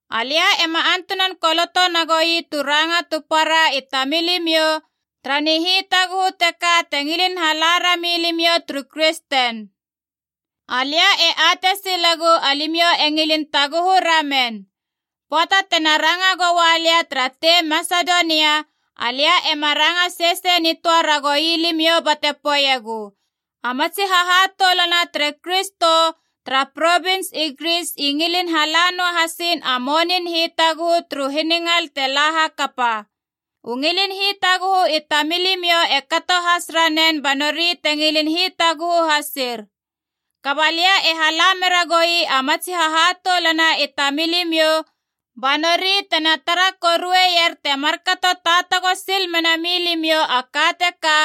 Alia ema antunan koloto nagoi tu raranga tu para i tamilimiou tara nihitaguhu teka te ngilin hala rami limiou turu kristen. Alia e atei silegu alimiou e ngilin taguhu ramen. Pöata tena ranga goua lia tara tei Masedonia, alia ena ranga sesei nitöa ragou limiou bate poeiegu, “A matsi hahatoulana tere Kristo tara provins i Gris i ngilin hala noa hasiin a monin hitaguhu turu hiningal te la hakapa.” U ngilin hitaguhu i tamilimiou e kato has ranen ba nori te ngilin hitaguhu hasir. Kaba lia e hala meragoui a matsi hahatoulana i tamilimiou ba nori tena tara korueier te markato taatago sil mena milimiou a ka teka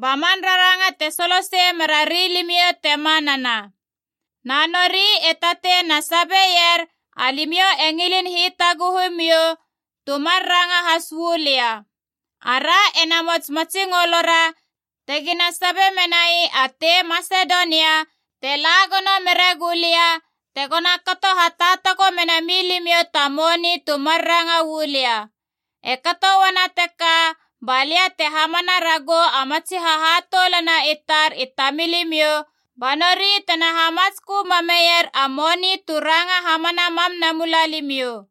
ba man raranga te solosei merari limiou te manana. Na nori e tatei na tara sabier alimiou e ngilin hitaguhu miou, tu mar ranga has uu lia. Ara ena mots matsingolora tegi na sabe menai a tei Masedonia te la gono mere gulia, tegoma kato taatago menami limiou ta moni tu mar ranga uu lia. E kato uana teka ba lia te hamam ragou a matsi hahatoulana i tar i tamilimiou, ba nori tena hamatskö mameier a moni tu ranga hamana mam namuma limiou.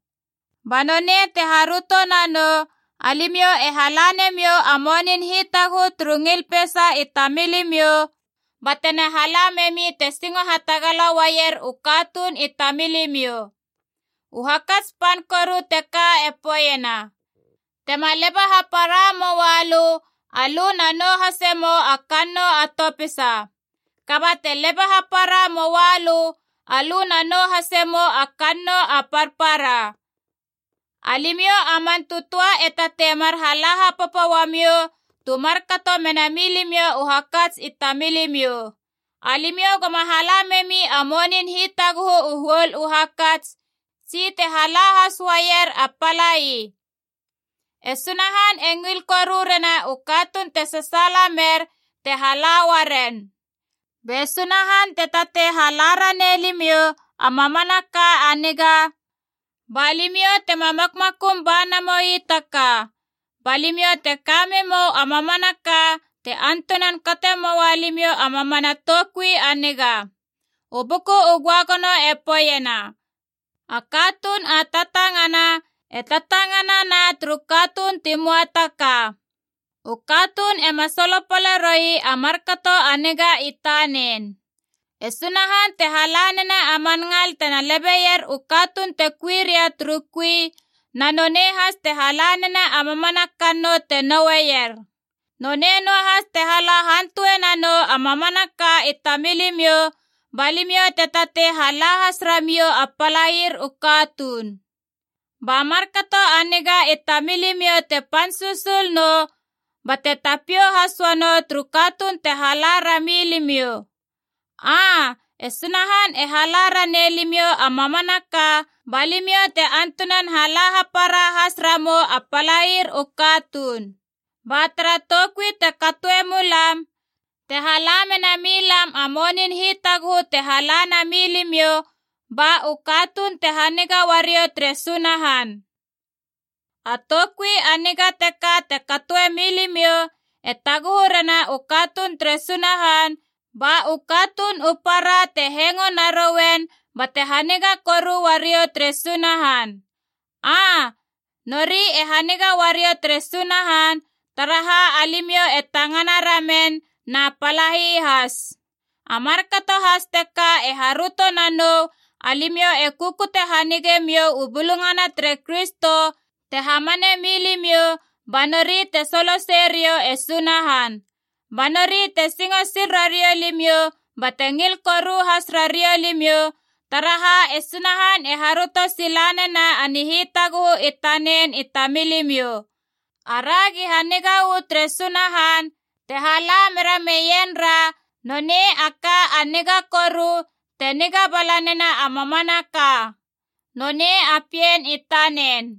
Ba nonei te haröto nanou alimiou e hala nemiou a monin hitaguhu turu ngil peisa i tamilimiou, batema hala memi te singo hatagala uaier u katuun i tamilimiou. U hakats pan koru teka e poeiena, tema leba hapara moalö, alö na nou hase mou a kannou a topisa. Kaba te leba hapara moalö, alö na nou hase mou a kannou a parpara. Alimiou a man tötöa e tatei mar hala hapopo uamiou tu markato mena milimiou u hakats i tamilimiou. Alimiou goma hala memi a monin hitaguhu u huol u hakats, tsi te hala has uaier a palai. E Sunahan e ngil koru rena u katuun te sasaala mer te hala uaren. Be Sunahan te tatei hala ranei limiou a mamanaka a niga, ba limiou tema makmakum ba namoi ta ka. Ba limiou te ka memou a mamanaka te antunan kate moa limiou a mamana toukui a niga. U Buku u Göagono e poeiena: “A katuun a tatangana e tatanganana turu katuun ti möa ta ka. U katuun ema solopale roi a markato a niga i tanen.” E Sunahan te hala nena a man ngal tena lebeier u katuun te kui ria turu kui, na nonei has te hala nena a mamana kannou te noueier. Nonei noahas te hala hantue nanou a mamanaka i tamilimiou ba limiou te tatei hala has ramiou a palair u katuun. Ba markato a niga i tamilimiou te pan susul nou bate tapiou has uanou turu katuun te hala ra milimiou. Aa, e Sunahan e hala ranei limiou a mamanaka ba limiou te antunan hala hapara has ramou a palair u katuun. Ba tara toukui te katoemulam, te hala mena milam a monin hitaguhu te hala na milimiou ba u katuun te haniga uariou tere Sunahan. A toukui a niga teka te katoe milimiou e taguhu rena u katuun tere Sunahan, ba u katuun u para te hengo narouen bate haniga koru uariou tere Sunahan. Aa, nori e haniga uariou tere Sunahan, taraha alimiou e tangana ramen na palai has. A markato has teka te haröto nanou alimiou e kukute hanige miou u Bulungana tere Kristo te hamane milimiou ba nori te soloseie riou e Sunahan. Ba nori te singo sil rariou limiou bate ngil koru has rariou limiou, taraha e Sunahan e haröto sila nena a nihitaguhu i tanen i tamilimiou. Aragi haniga uu tere Sunahan te hala mera meienra nonei a ka a niga koru te niga bala nena a mamanaka, nonei a Pien i tanen.